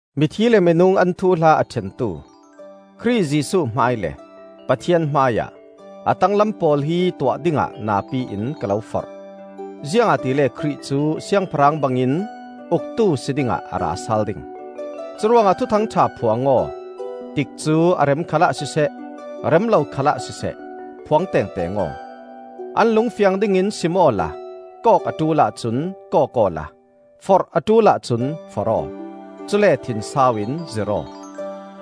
Mithi le minung an thuhla a ṭhentu Khrih Jesuh hmai le Pathian hmaiah a tanglam pawl hi tuah dingah napi in ka lo forh; ziangahtile Khrih cu Siangpahrang bangin uktu si dingah a rasal ding. Curuangah Thuthang ṭha phuang aw, tikcu a rem khalah siseh, rem lo khalah siseh, phuang tengteng aw; an lung fiang ding in sim awla kawk a ṭul ahcun kawk awla forh a ṭul ahcun forh aw; cule thinsau in zirh aw.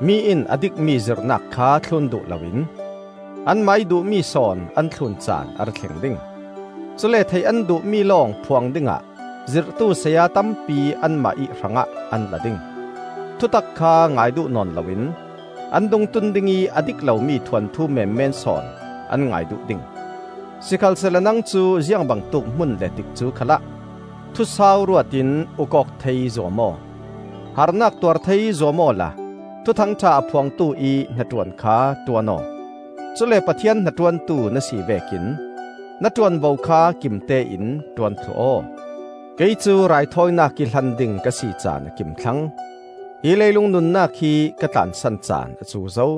Mi in a dikmi zirhnak kha thlun duh loin anmah ih duhmi sawn an thlun caan a ra thleng ding. Cule theih an duhmi lawng phuang dingah zirhtu saya tampi anmah ih hrangah an la ding. Thutak kha ngai duh nawn loin an dungtun ding ih a dik lomi thuanthu menmen sawn an ngai duh ding. Sikhalsehla nang cu ziang bangtuk hmun le tikcu khalah thusau ruatin uk awk thei zuam aw. Harnak tuar thei zuam awla Thuthang ṭha a phuangtu ih hnaṭuan kha ṭuan aw. Cule Pathian hnaṭuantu na si vekin na ṭuanvo kha kimtein ṭuan thluh aw. Kei cu raithawinak ih hlan ding ka si caan a kim thlang. Hi leilung nunnak hi ka tlansan caan a cu zo.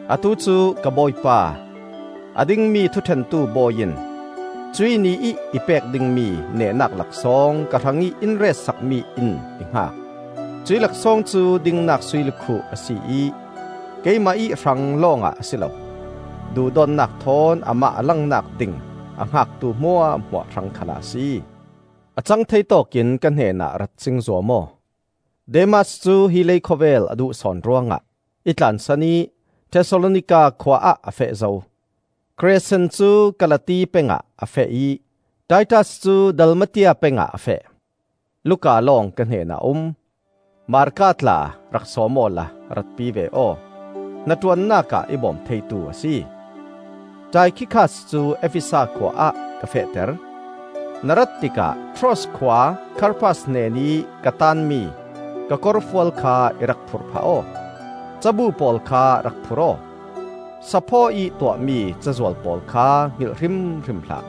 Atu cu ka Bawipa, a dingmi thuṭhentu Bawi in cuih Ni ih i pek dingmi nehnak laksawng ka hrangih in ret sakmi in i hngak. Cuih laksawng cu dingnak sui lukhuh a si ih keimah ih hrang lawngah a si lo; duhdawtnak thawn amah a langnak ding a hngaktu hmuahhmuah hrang khalah a si. A cang thei tawkin ka hnenah rat cing zuam aw. Demas cu hi leikhawvel a duh sawn ruangah i tlansan ih Thesalonika khua ah a feh zo. Kresen cu Kalati pengah a feh ih Titas cu Dalmatia pengah a feh. Luka lawng ka hnenah a um. Marka tla rak sawm awla ratpi ve aw, hnaṭuannak ah i bawm theitu a si. Taikhikas cu Efesa khua ah ka fehter. Na rat tikah Troas khua Karpas hnenih ka taanmi ka kawrfual kha i rak phurh phah aw. Cabu pawl kha rak phur aw; saphaw ih tuahmi cazual pawl kha hngilh hrimhrim hlah.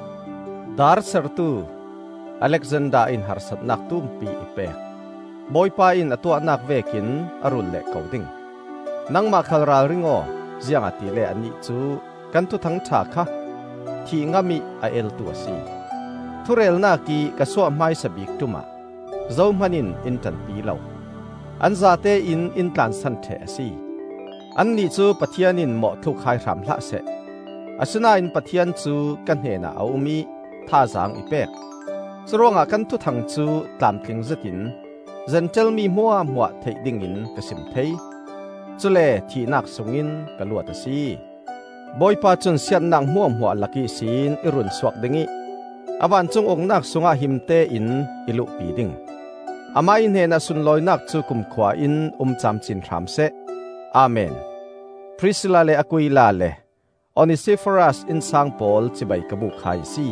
Daar sertu Alexander in harsatnak tumpi i pek. Bawipa in a tuahnak vekin a ruul leh ko ding. Nangmah khal ralring aw; ziangahtile anih cu kan Thuthang ṭha kha thih ngamih a eltu a si. Thurelnak ih ka suah hmaisa bik ṭumah zohman in in ṭanpi lo. An zatein in tlansan ṭheh a si. Annih cu Pathian in mawhthluk hai hram hlah seh. Asinain Pathian cu ka hnenah a um ih thazaang i pek; curuangah kan thuthang cu tlamtling zetin Zentail mi hmuahhmuah theih dingin ka sim thei. Cule thihnak sungin ka luat a si. Bawipa cun siatnak hmuahhmuah lak ihsin i runsuak ding ih a vancung Uknak sungah himte in i luhpi ding. Amah ih hnenah sunlawinak cu kumkhua in um camcin hram seh. Amen. Prisilla le Aquila le Onesiforas innsang pawl cibai ka buk hai a si.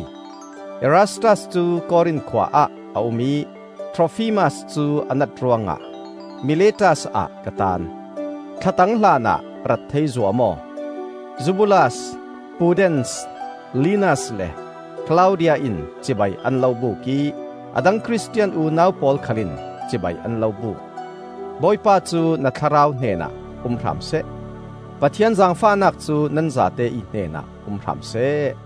Erastas cu Korin khua ah a um ih Trofimas cu a nat ruangah Miletas ah ka taan. Thlatang hlanah rat thei zuam aw. Zubulas, Pudens, Linas le Klaudia in cibai an lo buk ih a dang Khristian unau pawl khal in cibai an lo buk. Bawipa cu na thlarau hnenah um hram seh. Pathian zaangfahnak cu nan zate ih hnenah um hram seh.